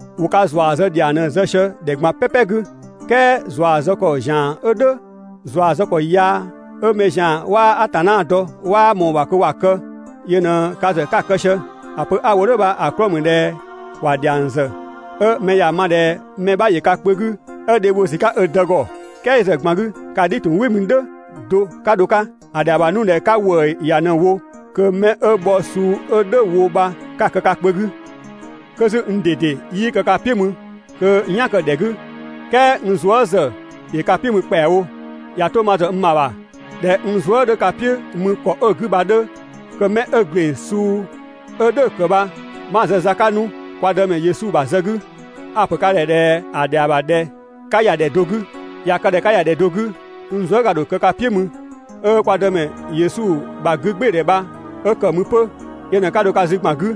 ‑Wo ka ‑zua zë ‑dhiang ꞊në‑ zë sië ‑dhɛ ꞊gban "pɛpɛ 'gü, "kɛɛ ‑zua zë ‑kɔ ‑zian 'ö "dhʋ̈, ‑zua zë ‑kɔ yaa 'ö mɛ ‑zian 'waa Atanna dɔ 'waa ꞊mɔɔ‑ ‑bha kö ‑wa kë, yö ꞊në ka ‑zë 'ka‑ kë sië. ‑A pö 'a‑ wo "dhʋ̈ bha‑ 'klɔɔ‑ ‑mü ꞊dhɛ ‑wa ‑dhiang ‑zë 'ö mɛ ‑ya ma ꞊dhɛ mɛ 'bha ‑yö ka kpö 'gü 'ö dhe bho ‑sü 'ka ö dë ‑gɔ! "Kɛɛ yö ‑zë ꞊gban 'gü ka "dhi‑ ‑tun "wɩ mü "dhʋ̈ do 'ka dho‑ 'ka. ‑A ‑dhɛa ‑bha 'nu ꞊dhɛ 'ka ‑wëë ‑ya ꞊në‑ wo kö 'mɛ 'ö bhɔ suu 'ö "dhʋ̈‑ wo bha 'ka‑ kë ka kpö 'gü. 'Kö 'zü n ꞊dede 'yii kë ka "piʋ̈ mü kö n "yan‑ kë‑ ‑dhɛ 'gü, "kɛɛ n zuë" ‑zë ‑yö ka "piʋ̈ mü ‑kpɛawo. ꞊Ya 'to ma ‑zë n ‑bha ‑bha, ꞊dhɛ n zuë" 'dhö ka "piʋ̈ mü ‑kɔ 'ö‑ 'gü bha‑ 'dhö, kö 'mɛ 'ö ‑gleng suu 'ö "dhʋ̈‑ ‑kë bha 'ma‑ zë za 'ka 'nu kwa Dëmɛ Yesu ‑bha zë 'gü. A‑ ‑pö ka ‑dhɛ ꞊dhɛ ‑a ‑dhɛa ‑bha ꞊dhɛ 'ka ‑ya ‑dhɛ do 'gü, ꞊ya kë ꞊dhɛ ka ‑ya ‑dhɛ do 'gü n zuëga‑ ‑dho kë ka "piʋ̈ mü, 'ö kwa Dëmɛ Yesu ‑bha 'gügbɩɩdhɛ bha 'ö ‑kë mü 'pö. Yö ꞊në 'ka dho ka zü ‑gban 'gü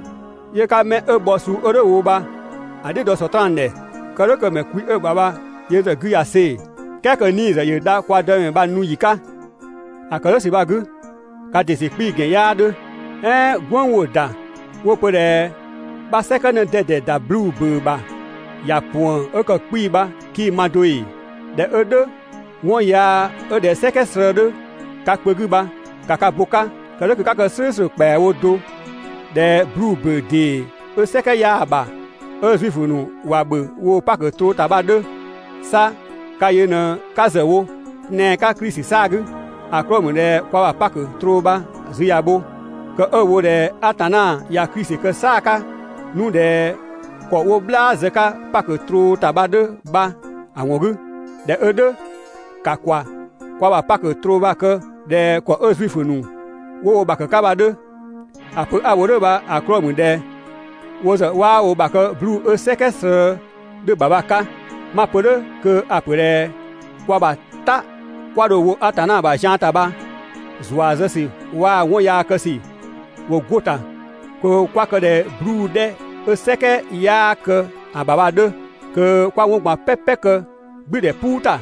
'yö 'ka 'mɛ 'ö bhɔ suu 'ö "dhʋ̈‑ wo bha‑ "dhiʋ̈ dɔ Sɔtraan ‑dhɛ, kë "dhʋ̈ kö‑ ‑mɛ kwi 'ö‑ ‑bha bha yö ‑zë 'gü ꞊ya see‑, "kɛɛ kö‑ 'nii‑ ‑zë ‑yö dha kwa Dëmɛ bha‑ nu ‑yi 'ka. ‑A ‑kë "dhʋ̈ ‑sü bha‑ 'gü, ka ‑dɩ ‑sü 'kpii‑ ‑gɛn 'yaa 'dhö. "Ɛɛn "gwënng 'wo‑ ‑da 'wo‑ pö ꞊dhɛ 'bha «"sɛkɛ 'në 'dɛdɛ ‑da 'bluu‑ ‑bʋ̈ʋ̈ ‑bha ‑ya ‑puën 'ö ‑kë 'kpii‑» bha 'kii‑ ma do ‑ee? ꞊Dhɛ 'ö "dhʋ̈, 'wɔn yaa 'ö ꞊dhɛ "sɛkɛ slëë 'dhö ka kpö 'gü bha, ‑ka ka bo‑ 'ka kë "dhʋ̈ kö 'ka kë "slʋ̈ʋ̈slʋ̈ ‑kpɛawo do ꞊dhɛ 'bluu‑ ‑bʋ̈ʋ̈ ‑dee 'ö "sɛkɛ 'yaa‑ ‑bha, ('ö Zuifö ‑nu ‑wa ‑bhö woo‑ Pakö troo ‑ta bha‑ 'dhö). 'Sa ka yö ꞊në‑ 'ka ‑zë wo tɛan‑ 'ka Klisi 'saa‑ 'gü. ‑A 'klɔɔ‑ ‑mü ꞊dhɛ kwa ‑bha Pakö troo bha‑ zü ꞊ya bho, kë 'ö‑ wo ꞊dhɛ Atanna ꞊ya Klisi kë "saa‑ 'ka 'nu ꞊dhɛ ‑kɔ 'wo "bhlaa zë‑ 'ka Pakö troo ‑ta bha‑ 'dhö bha‑ ‑wɔn 'gü. ꞊Dhɛ 'ö "dhʋ̈, ‑ka ‑kwa kwa ‑bha Pakö troo bha‑ kë ꞊dhɛ ‑kɔ 'ö Zuifö ‑nu 'wo wo ‑bha ‑kë 'ka bha‑ 'dhö. ‑A pö 'a‑ wo "dhʋ̈ bha‑ 'klɔɔ‑ ‑mü ꞊dhɛ wo ‑zë 'waa wo ‑bha kë 'bluu‑ 'ö "sɛkɛ slëë 'dhö‑ ‑bha bha‑ 'ka. 'Ma‑ pö "dhʋ̈ kö a‑ ‑pö ꞊dhɛ kwa ‑bha "ta 'kwa dho‑ wo Atanna ‑bha zian ‑ta bha ‑zua zë ‑sü waa‑ 'wɔn yaa kë ‑sü ‑wo 'go‑ ‑ta kö 'kwa kë ꞊dhɛ 'bluu‑ 'dhɛ 'ö "sɛkɛ 'yaa kë‑ ‑bha bha‑ 'dhö, kö 'kwa 'wɔn ꞊gban "pɛpɛ kë "gblʋ̈ʋ̈dhɛ "puu ‑ta,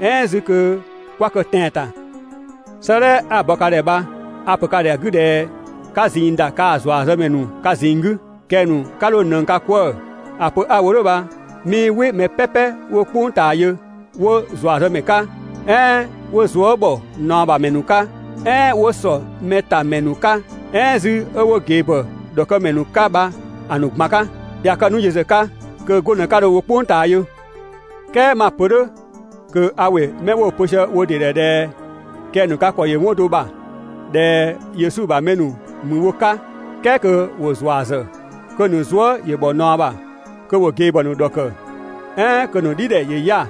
"ɛɛn 'zü kö 'kwa‑ ‑kë tɛan‑ ‑ta. 'Sëëdhɛ 'a‑ bɔ ka ‑dhɛ bha a‑ ‑pö ka ‑dhɛ ‑a 'gü ꞊dhɛ 'ka ꞊zinng ‑da kaa‑ ‑zuazëmɛ ‑nu ka ꞊zinng 'gü, kɛng‑ ‑nu 'ka 'dho ꞊nëng ka 'kwëë‑. ‑A pö 'a ‑wo "dhʋ̈ bha 'mii "wɩ mɛ "pɛpɛ 'wo "kpʋng ꞊taa yö, 'wo ‑zuazëmɛ 'ka, "ɛɛn 'wo zuë" ‑bhɔ ꞊naɔ ‑bha ‑mɛ ‑nu 'ka, "ɛɛn 'wo ‑sɔmɛtamɛ ‑nu 'ka, "ɛɛn 'zü 'wo ꞊gebhɔ ‑dhɔkëmɛ ‑nu 'ka bha‑ ‑nu ꞊gban 'ka. ꞊Ya kë 'nu yö ‑zë 'ka, kö 'go ꞊në 'ka dho‑ wo "kpʋng ꞊taa yö. "Kɛɛ 'ma‑ pö "dhʋ̈ kö a ‑wɩ 'mɛ 'wo‑ pö sië wo ‑dɩ ‑dhɛ ꞊dhɛ kɛng‑ ‑nu ka ‑kɔ ‑yö 'wɔn do ‑bha, ꞊dhɛ Yesu ‑bha mɛ ‑mü wo 'ka, "kɛɛ kö ‑wo ‑zua ‑zë, kö‑ ‑nu zuë" ‑yö ‑bhɔ ꞊naɔ ‑bha, kö ‑wo ꞊gebhɔ ‑nu ‑dhɔkë, "ɛɛn kö‑ ‑nu "dhidhɛ ‑yö 'ya‑,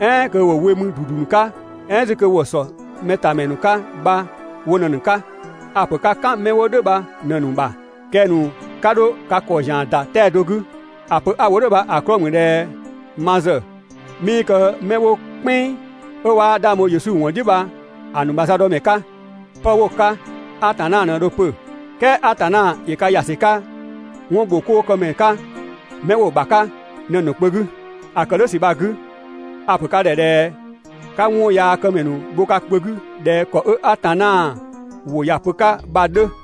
"ɛɛn kö ‑wo we mü ‑dudu 'ka, "ɛɛn 'zü kö ‑wo ‑sɔmɛtamɛ ‑nu 'ka bha wo ꞊në‑ ‑nu 'ka. A‑ ‑pö 'ka "kan 'mɛ wo "dhʋ̈ bha ꞊në‑ ‑nu ‑bha. Kɛng‑ ‑nu 'ka 'dho ka ‑kɔ ‑zian ‑da 'tɛa‑ do 'gü. ‑A pö 'a‑ wo "dhʋ̈ bha‑ 'klɔɔ‑ ‑mü ꞊dhɛ ma ‑zë 'mii kë 'mɛ 'wo "kpɛnng, 'ö 'waa 'dhang bho Yesu ‑wɔn "dhiʋ̈ bha‑ ‑nu ‑bha za dɔ mɛ 'ka. 'Pë 'wo‑ 'ka, Atanna ꞊në dho‑ pö. "Kɛɛ Atanna ‑yö ka ‑ya ‑sü 'ka 'wɔnbhokoomɛ 'ka 'mɛ 'wo‑ ‑bha 'ka bha ꞊në‑ ‑nu kpö 'gü. ‑A ‑kë "dhʋ̈ ‑sü bha‑ 'gü, a‑ ‑pö ka ‑dhɛ ꞊dhɛ 'ka 'wɔn yaa këmɛ bho ka kpö 'gü ꞊dhɛ ‑kɔ 'ö Atanna ‑wʋ ‑ya pö‑ 'ka bha‑ 'dhö.